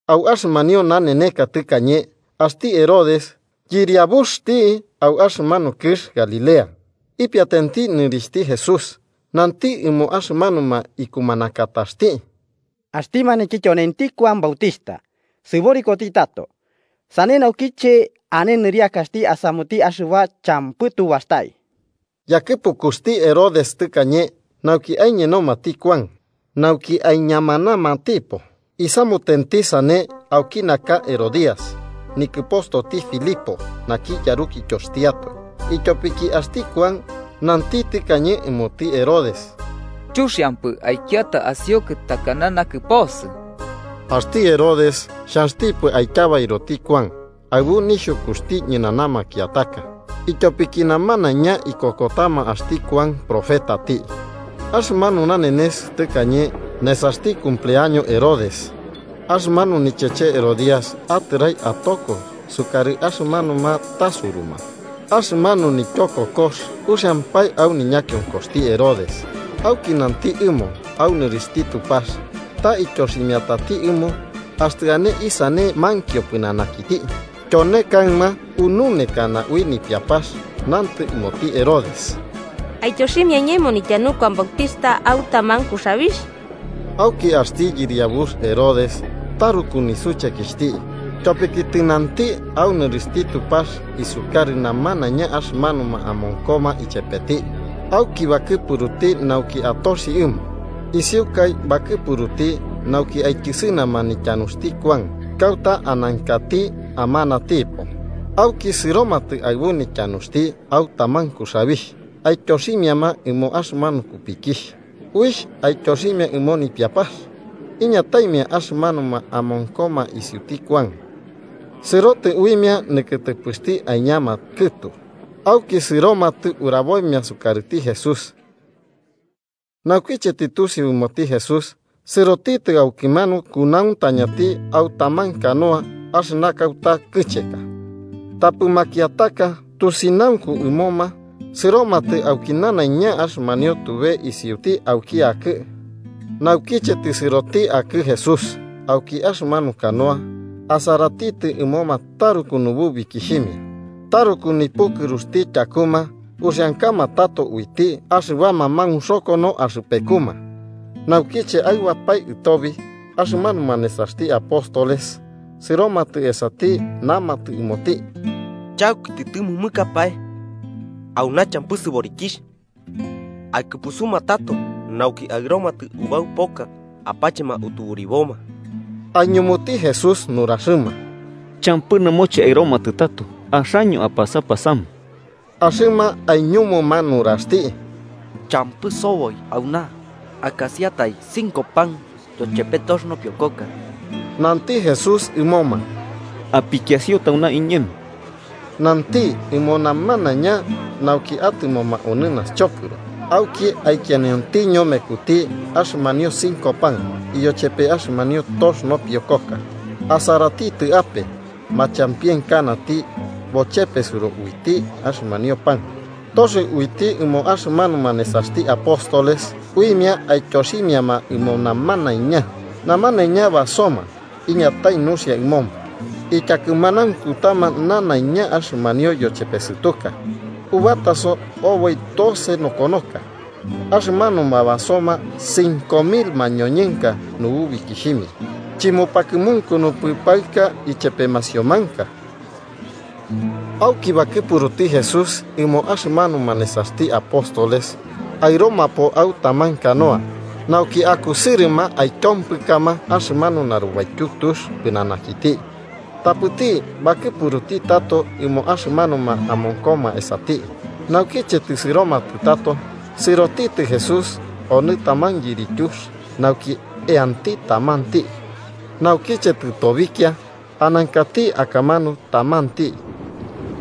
Au axɨmanio naneneka tɨkañe, axti Herodes, yɨriabuxti au axɨmanu kɨx Galilea, ipiatenti nɨrixhti Jesús, nanti ɨmo axɨmanuma ikumanakataxti: “Axti maniki tyonenti Kuan Bautixhta, sɨborikoti tato. Sane naukiche ane nɨriakaxti asamuti axɨba champɨ tu bastai.” Yakɨpukuxti Herodes tɨkañe nauki aiñenomati Kuan nauki aiñamanamatipo. Isamutenti sane auki naka Herodías nikɨpostoti Filipo naki yarukityoxtiatoe, ityopiki axti Kuan nanti tɨkañe ɨmoti Herodes: “Chuxiampɨ aikiata asiukɨ takana nakɨposɨ.” Axti Herodes, xhanxtipɨ aityabairoti Kuan, aɨbu nixhukuxti ñɨnana makiataka, ityopiki namanaiña ikokotama axti Kuan profetati. Axɨmanu nanenes tɨkañe nesaxti cumpleaño Herodes, axɨmanu nicheche Herodías atɨrai atoko sukarɨ axɨmanuma tasuruma, axɨmanu nityokokox uxiampae au niñakionkoxti Herodes auki nanti ɨmo au nɨrixhti Tupax ta ityoximiatati ɨmo axtɨ ane isane mankio pɨnanakiti. Tyone kaɨma, ununekana ui nipiapax, nantɨ ɨmoti Herodes: –Aityoximia iñemo nityanu Kuan Bautixhta au taman kuxabix. Auki axti yɨriabux Herodes taruku nisuchekixhti. Tyopiki tɨnanti au nɨrixhti Tupax isukarɨ namanaiña axɨmanuma amonkoma ichepeti, auki bakɨpuruti nauki atoxi ɨmo. Isiukai bakɨpuruti, nauki, aityɨsɨnama nityanuxti Kuan kauta anankati amanatipo. Auki sɨromatɨ aɨbu nityanuxti au taman kuxabixh aityoximiama ɨmo axɨmanu kupikixh, uixh aityoximia ɨmo nipiapax. Iñataimia axɨmanuma amonkoma isiuti Kuan, sɨrotɨ uimia nikɨtɨpɨxti aiñama kɨtu. Auki sɨromatɨ uraboimia sukarɨti Jesús. Naukiche tɨtusiu ɨmoti Jesús, sɨrotitɨ aukimanu kunauntañati, au taman canoa, axɨna kauta kɨcheka. Tapɨ makiataka tusinaunku ɨmoma sɨromatɨ auki nanaiña axɨmanio tube isiuti auki akɨ. Naukiche tɨsɨroti akɨ Jesús auki axɨmanu canoa, asaratitɨ ɨmoma taruku nububikixhimia. Taruku nipukɨruxti tyakuma uxiankama tato uiti axɨbama maunxokono axɨpekuma. Naukiche aɨbapae ɨtobi, axɨmanuma nesaxti apóstoles sɨromatɨ esati namatɨ ɨmoti: –Chauki tɨtɨmɨmɨkapae, auna champɨ sɨborikixh. Aikɨpusuma tato, nauki aɨromatɨ ubau poka apachema utuburiboma. Aiñumuti Jesús nuraxɨma: –Champɨ nɨmoche aɨromatɨ tato, axaño apasapasama. Axɨma aiñumuma nuraxti: –Champɨ soboi auna akasiatai cinco pan yochepe tox nopiokoka. Nanti Jesús ɨmoma: –Apikiasio tauna iñemo. Nanti ɨmo namanaiña nauki atɨmoma onɨ naxchopɨro. Auki aikianiontiño mekuti axɨmanio cinco pan yochepe axɨmanio tox nopiokoka, asaratitɨ ape, machampienkanati bochepesɨro uiti axɨmanio pan, toxio uiti ɨmo axɨmanuma nesaxti apóstoles uimia aityoximiama ɨmo namanaiña. Namanaiña basoma iñatai nuxia ɨmoma. Ityakɨmanaunkutama nanaiña axɨmanio yochepesɨtuka, ubataso oboi doce nokonoka. Axɨmanuma basoma cinco mil mañoñɨnka nububikixhimia, chɨmupakɨmunkunupɨ paɨka ichepe masiomanka. Auki bakɨpuruti Jesús ɨmo axɨmanuma nesaxti apóstoles aɨromapo au taman canoa, nauki akusɨrɨma aityompɨkama axɨmanu narubaityu tux pɨnanakiti, tapɨti bakɨpuruti tato ɨmo axɨmanuma amonkoma esati. Naukiche tɨsɨromatɨ tato, sɨrotitɨ Jesús onɨ taman yirityux nauki eanti tamanti. Naukiche tɨtobikia, anankati akamanu tamanti,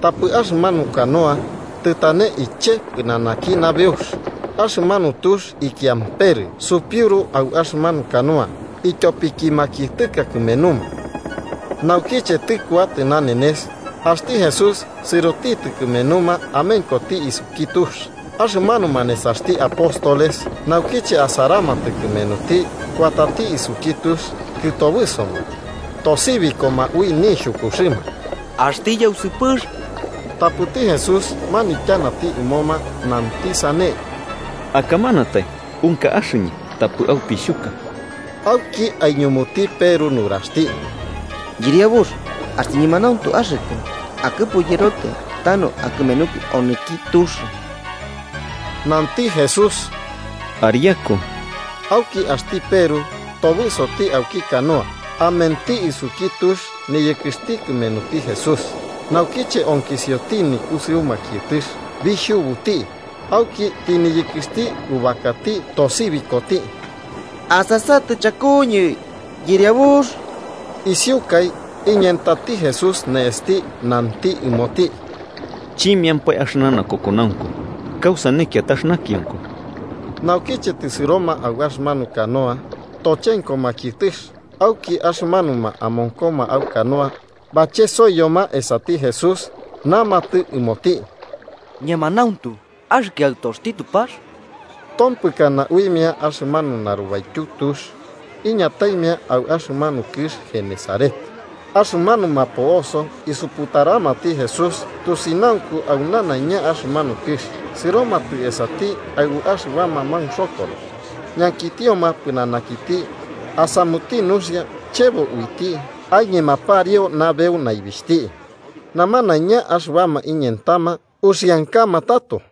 tapɨ axɨmanu canoa tɨtane iche pɨnanaki nabeux. Axɨmanu tux ikiamperɨ supiuru au axɨmanu canoa, ityopiki makiɨtɨka kɨmenuma. Naukiche tɨkuatɨ nanenes, axti Jesús sɨrotitɨ kɨmenuma amenkoti isuki tux. Axɨmanuma nesaxti apóstoles naukiche asaramatɨ kɨmenuti kuatati isuki tux, kɨtobɨsoma, tosibikoma ui nixhukuxɨma: –¡Axti yausɨpɨx! Tapɨti Jesús manityanati ɨmoma, nanti sane: –¡Akamanatai! ¡Unka axɨñɨ: tapɨ aupixhuka! Auki aiñumuti Peru nuraxti: –Yɨriabux, axtɨ ñemanauntu axɨkɨ, akɨpu yɨrotɨ tanu akɨmenukɨ onɨki tux. 29–Ariaku–nanti Jesús. Auki axti Peru tobɨsoti auki canoa amenti isuki tux niyɨkɨxti kɨmenuti Jesús. Naukiche onkisioti nikusɨu makiɨtɨx, bixhubuti. Auki tɨniyɨkɨxti ubakati, tosibikoti: –¡Asasatɨ chakuñɨ, Yɨriabux! Isiukai, iñentati Jesús ne'esti nanti ɨmoti: –¡Chimiampae axɨna nakokonaunku! ¿Kausane kiatax nakionkoko? Naukiche tɨsɨroma au axɨmanu canoa, tochenko makiɨtɨx. Auki axɨmanuma amonkoma au canoa bachesoiyoma esati Jesús, namatɨ ɨmoti: –¡Ñemanauntu axɨkɨ Aɨtoxti Tupax! Tompɨkana uimia axɨmanu narubaityu tux iñataimia au axɨmanu kɨx Genesaret. Axɨmanuma po'oso isuputaramati Jesús, tusinaunku au nanaiña axɨmanu kɨx. Sɨromatɨ esati aɨbu axɨbama maunxokono, ñankitioma pɨnanakiti asamuti nuxia chebo uiti aiñema pariu nabeu naibixhti. Namanaiña axɨbama iñentama, uxiankama tato.